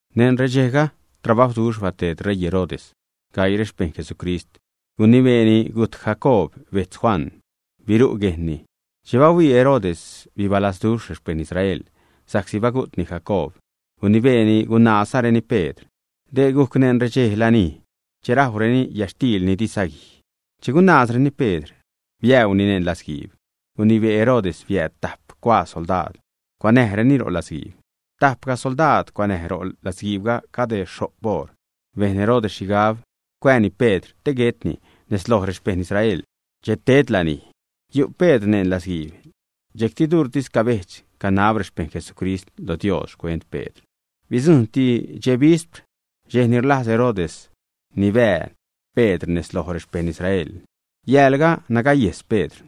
Neṉ redxejga, trabajwduxh bateed ṟeii Herodes gaii rexpejṉ Jesucrist. Gunibeeni gujt Jacoob betz Juan, biru' guejnni. Che bahuii Herodes bibalazduxh rexpejṉ Israel sa'csi bagu'tni Jacoob, gunibeeni gunazgajcreni Pedr. Dee gujc neṉ redxe lanij che rajwreni yätxtiil ni di saguij. Che gunaazreni Pedr, biäuni neṉ latzguiib. Gunibee Herodes biääd tajp cuaa soldaad cuanäjreni ro' latzguiib. Tapgaj soldaad cuanäj ro' latzguiibga cade xho'p oṟ. Bejn Herodes xhigab cuääni Pedr te guetni nez loj rexpejṉ Israel che ted lanij. Yu'ti Pedr neṉ latzguiib, dxejcti durtis cabejdx, canab rexpejṉ Jesucrist lo Dios xcuent Pedr. Bidzujṉti dxe bispr dxej ni rlajz Herodes nibää Pedr nez loj rexpejṉ Israel. Yäälga nagayejs Pedr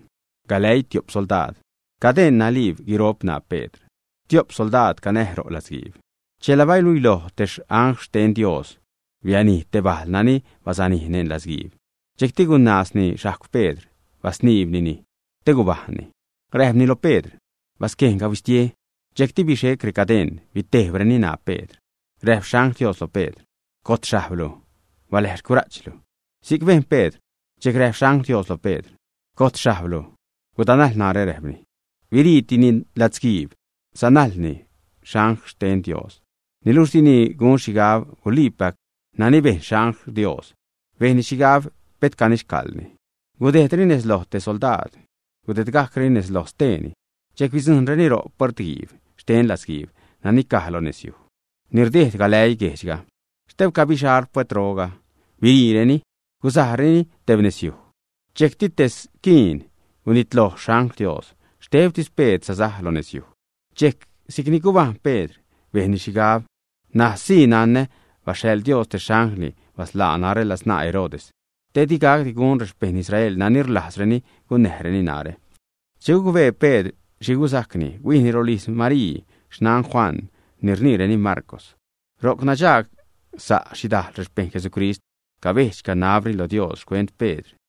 galäii tiop soldaad. Cadeṉ naliib guiro'p ṉaa Pedr. Stiop soldaad canäj ro' latzguiib. Chela baluiloj te angl xten Dios, bianij te bajl nani basanij neṉ latzguiib. Dxejcti gunaazni xhajcw Pedr, basniibnini te gubajṉni. Räjpni lo Pedr: ―Basquejnga, huistie. Dxejcti bixec recadeṉ, bitejbreni ṉaa Pedr. Räjp xangl Dios lo Pedr: ―Gojt xhajblu, baläj xcura'chlu. Si'c bejn Pedr, dxejc räjp xangl Dios lo Pedr: ―Gojt xhablajzlu, gudanajl narä ―räjpni. Biriitini latzguiib sanajlni angl xten Dios. Niluxh dini gun xhigab guliipac nani bejn xangl Dios. Bejnni xhigab pet canixcaḻni. Gudejdreni nez loj te soldaad, gudedgajcreni nezloj steeni, dxejc bidzujṉreni ro' puertguiib xten latzguiib nani caj lo nezyuj ni rdejd galäii guejdxga. Xtebca bixal puertroga, biriireni gusajreni tebnezyuj. Dxejcti te squiin gunitloj xangl Dios. Xtebtis Pedr sasaj lo nezyuj. Dxejc si'cni gubajṉ Pedr, bejnni xhigab: ―N̲aj sii nanä baxhaḻ Dios te xanglni basḻaa narä ladzṉaa Herodes te digacdi gun rexpejṉ Israel nani rlajzreni gunnäjreni narä. Che gucbee Pedr xhi gusajcni, huijni rolijz Marii, xnan Juan ni rniireni Marcw. Ro'c nadxagsa' xhidajl rexpejṉ Jesucrist, cabedx-canabreni lo Dios xcuent Pedr.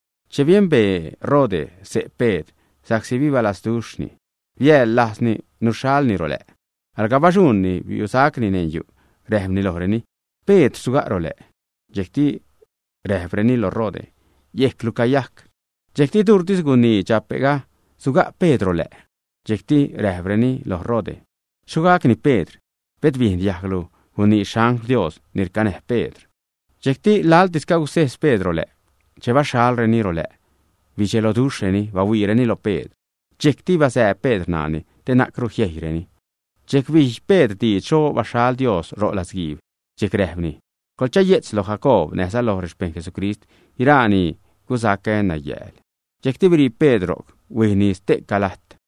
Che biembee Rode xse' Pedr, sa'csi bibalazduxhni, biaḻlajzni nuxhalni ro lä'. Alga baxuṉni biusacni neṉ yu', räjpni lojreni: ―Pedr suga' ro lä'. Dxejcti räjpreni lo Rode: ―Yejclu cayajc. Dxejcti duurtis gunii dxape'ga suga' Pedr ro lä'. Dxejcti räjpreni loj Rode: ―Xho gacni Pedr. Pet biejn diajglu gunii xangl Dios ni rcanäj Pedr. Dxejcti laḻtis cagusejz Pedr ro lä'. Che baxhalreni ro lä' bidxeloduxhreni bahuiireni lo Pedr. Dxejcti bazääb Pedr ṉaani te na'cru jiejyreni. Dxejc bij Pedr diidx xho baxhal Dios ro' latzguiib. Dxejc räjpni: ―Coḻchaye'tz lo Jacoob näjza lo rexpejṉ Jesucrist guiraa ni gusacä nayääl. Dxejcti birii Pedr ro'c, huijni ste'ca lajt.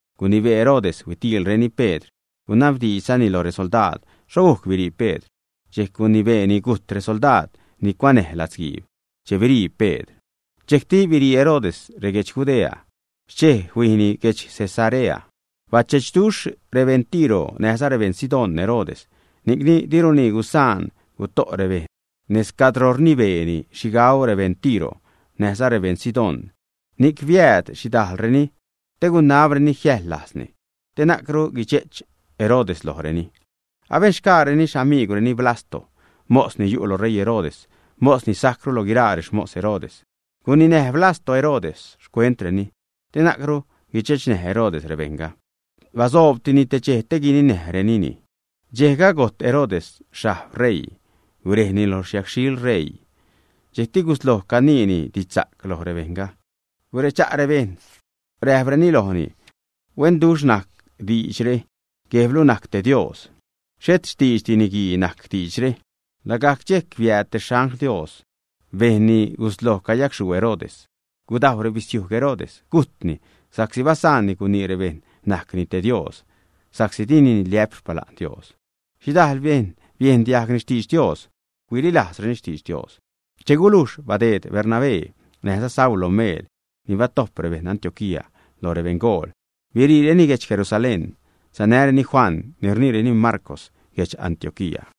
Gunibee Herodes huitiilreni Pedr, gunabdiidxzani lo resoldaad xho gujc birii Pedr, dxejc gunibeeni gujt resoldaad ni cuanäj latzguiib che birii Pedr. Dxejcti birii Herodes reguedx Judea, xchej huijia'nni guedx Cesarea. Bachechduxh rebeṉ Tiro näjza rebeṉ Sidón Herodes, ni'cni diruni gusaan guto' rebejṉ nez cadro rnibeeni xhi gau rebeṉ Tiro näjza rebeṉ Sidón. Ni'c biääd xhidajlreni te guiniabreni jiäjḻ lajzni, te na'cru guidxe'ch Herodes lojreni. Abenxgaareni xamiigwreni Blasto, mos ni yu' lo ṟeii Herodes, mos ni sajcru lo guiraa rexmos Herodes. Guninäj Blasto Herodes xcuentreni te na'cru guidxechnäj Herodes rebejṉga. Basoobtini te dxej te guininäjnireni. Dxejga gojt Herodes xhajb ṟeiini, gurejni lo xyacxhiḻ ṟeiini. Dxejcti gusloj caniini didxsa'c loj rebejṉga. Guredxa' rebejṉ räjpreni lojni: ―Huenduxh najc diidxre. Guejblu najc te dios, xhet xtiidxdi niguii najc diidxre. Lagajc dxejc biääd te angl xten Dios, bejnni gusloj cayacxhuu Herodes, gudajw rebisiujg Herodes, gujtni sa'csi basaanni gunii rebejṉ najcni te dios, sa'csi dini niliä'p xpala'n Dios. Xhidajl bejṉ biejn diajgni xtidx Dios, huililajzreni xtidx Dios. Che gulujx badeed Bernabé näjza Saulo meel ni batojp rebeṉ Antioquía lo rebeṉgool, biriireni guedx Jerusalén. Sanäreni Juan ni rniireni Marcw lo guedx Antioquía.